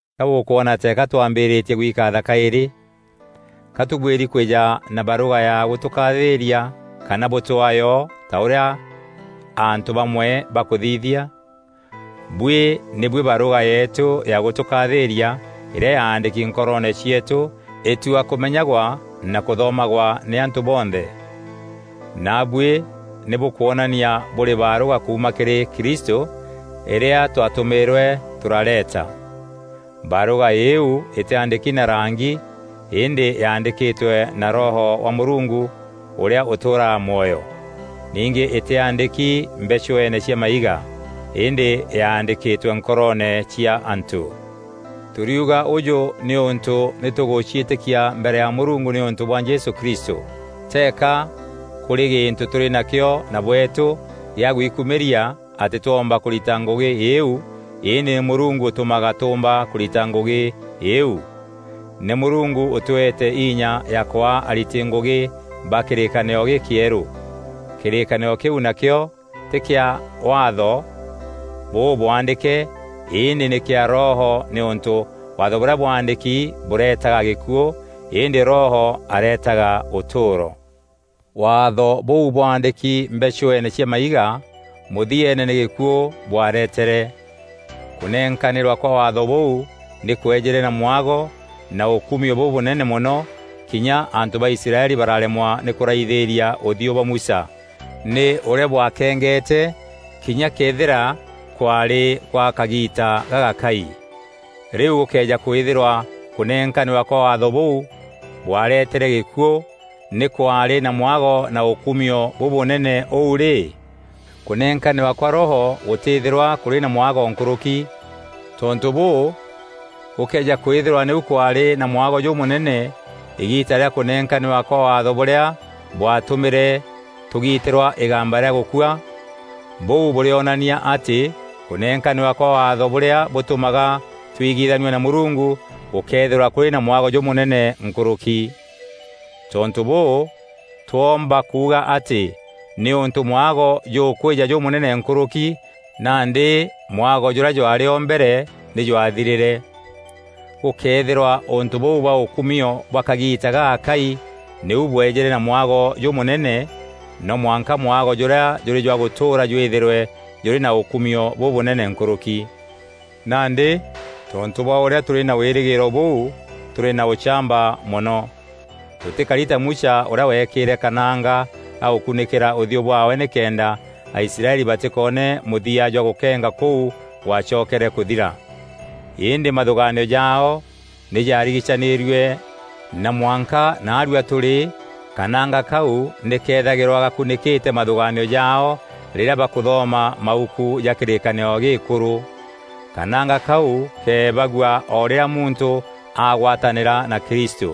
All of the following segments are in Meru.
Ka bûkwoona teeka twambîîrîtie gwikaatha kaîrî? Ka tûbuîri kwîja na barûga ya gûtûkathîîria kana bûtwaa yo ta ûrîa antû bamwe bakûthithia? Bûi nî buî barûga yeetû ya gûtûkathîîria îrîa yaandîki nkoroone cieetû îtua kûmenyagwa na kûthomagwa nî antû bonthe. Naabuî nî bûkwonania bûrî barûga kuuma kîrî Kristû îrîa twatûmîîrwe tûrareeta. Barûga îîu îtîaandîki na rangi îndî yaandîkîtwe na Roho wa Mûrungu ûrîa ûtûûraga mwoyo. Ningî îtîaandîki mbechueene cia maiga îndî yaandîkîtwe nkoroone cia antû. Tûriuga ûjû nîûntû nî tûgûciîtîkia mbere ya Mûrungu nîûntû bwa Jesû Kristû. Teeka kûrî gîntû tûrî nakîo na bweetû kîa gwikûmîria atî twoomba kûrita ngûgî îîu îndî nî mûrungu ûtûmaga tûûmba kûrita ngûgî iu. Nî Mûrungu ûtweete inya ya kwaa ariti ngûgî ba kîrîkanîro gîkîerû. Kîrîkanîro kîu nakîo tî kîa Waatho bûbwaandîke îndî nî kîa Roho nîûntû Waatho bûrîa bwaandîki bûreetaga gîkuû, îndî Roho areetaga ûtûûro. Waatho bûu bwaandîki mbechueene cia maiga mûthieene nî gîkuû bwaaretere. Kûnenkanîrwa kwa Waatho bûu nî kwejîre na mwago na ûkumio bûbûnene mono kinya antû ba Israeli bararemwa nî kûraithîîria ûthiû bwa Musa nî ûrîa bwakengete kinya këethîra kwaarî gwa kagiita gagakai. Rîu gûkëeja kwîthîrwa kûnenkanîrwa kwa Waatho bûu bwaaretere gîkuû nî kwaarî na mwago na ûkumio bûbûnene ûu rî, kûnenkanîrwa kwa Roho gûtîthîrwa kûrî na mwago nkûrûki? Tontû bûû, gûkëeja kwîthîrwa nîu kwaarî na mwago jûmûnene îgiita rîa kûnenkanîrwa kwa Waatho bûrîa bwaatûmîre tûgitîrwa îgamba rîa gûkua, bûu bûrîonania atî kûnenkanîrwa kwa Waatho bûrîa bûtûmaga twigithanua na Mûrungu gûkeethîrwa kûrî na mwago jûmûnene nkûrûki. Tontû bûû, twoomba kuuga atî nîûntû mwago jûkwîja jûmûnene nkûrûki, nandî mwago jûrîa jwaarî o mbere nî jwathirîre. Gûkëethîrwa ûntû bûu bwa ûkumio bwa kagiita gagakai nîu bweejîre na mwago jûmûnene, no mwanka mwago jûrîa jûrî jwa gûtûûra jwîthîrwe jûrî na ûkumio bûbûnene nkûrûki. Nandî tontû bwa ûrîa tûrî na wîrîgîîro bûû, tûrî na ûchamba mono. Tûtîkari ta Musa ûrîa weekîîre kananga ka gûkunîkîra ûthiû bwaawe nîkenda Aisraeli batîkoone mûthia jwa gûkenga kûu gwacokere kûthira. Îndî mathûgaanio jaao nî jaarigicanîrue na mwanka naarua tûrî kananga kau nî kethagîrwa gakûnîkîte mathûgaanio jaao rîrîa bakûthoma mauku ja kîrîkanîro gîîkûrû. Kananga kau keebagua o rîrîa muntû aagwatanîra na Kristû.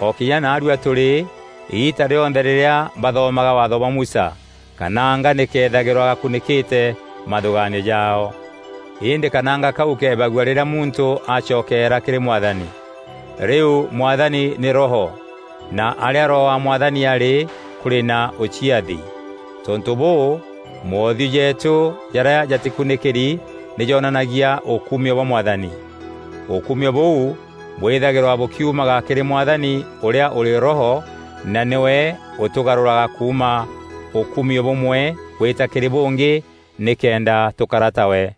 O kinya naarua tûrî, îgiita rîonthe rîrîa bathomaga Waatho bwa Musa, kananga nî kethagîrwa gakunîkîte mathûgaanio jaao. Îndî kananga kau keebagua rîrîa muntû acokeera kîrî Mwathani. Rîu Mwathani nî Roho na arîa Roho wa Mwathani arî, kûrî na ûciathi. Tontû bûû, moothiû jeetû jarîa jatîkunîkîri nî joonanagia ûkumio bwa Mwathani. Ûkumio bûu bwîthagîrwa bûkiumaga kîrî Mwathani ûrîa ûrî Roho na nîwe ûtûgarûraga kuuma ûkumio bûmwe gwîta kîrî bûngî nîkenda tûkara tawe.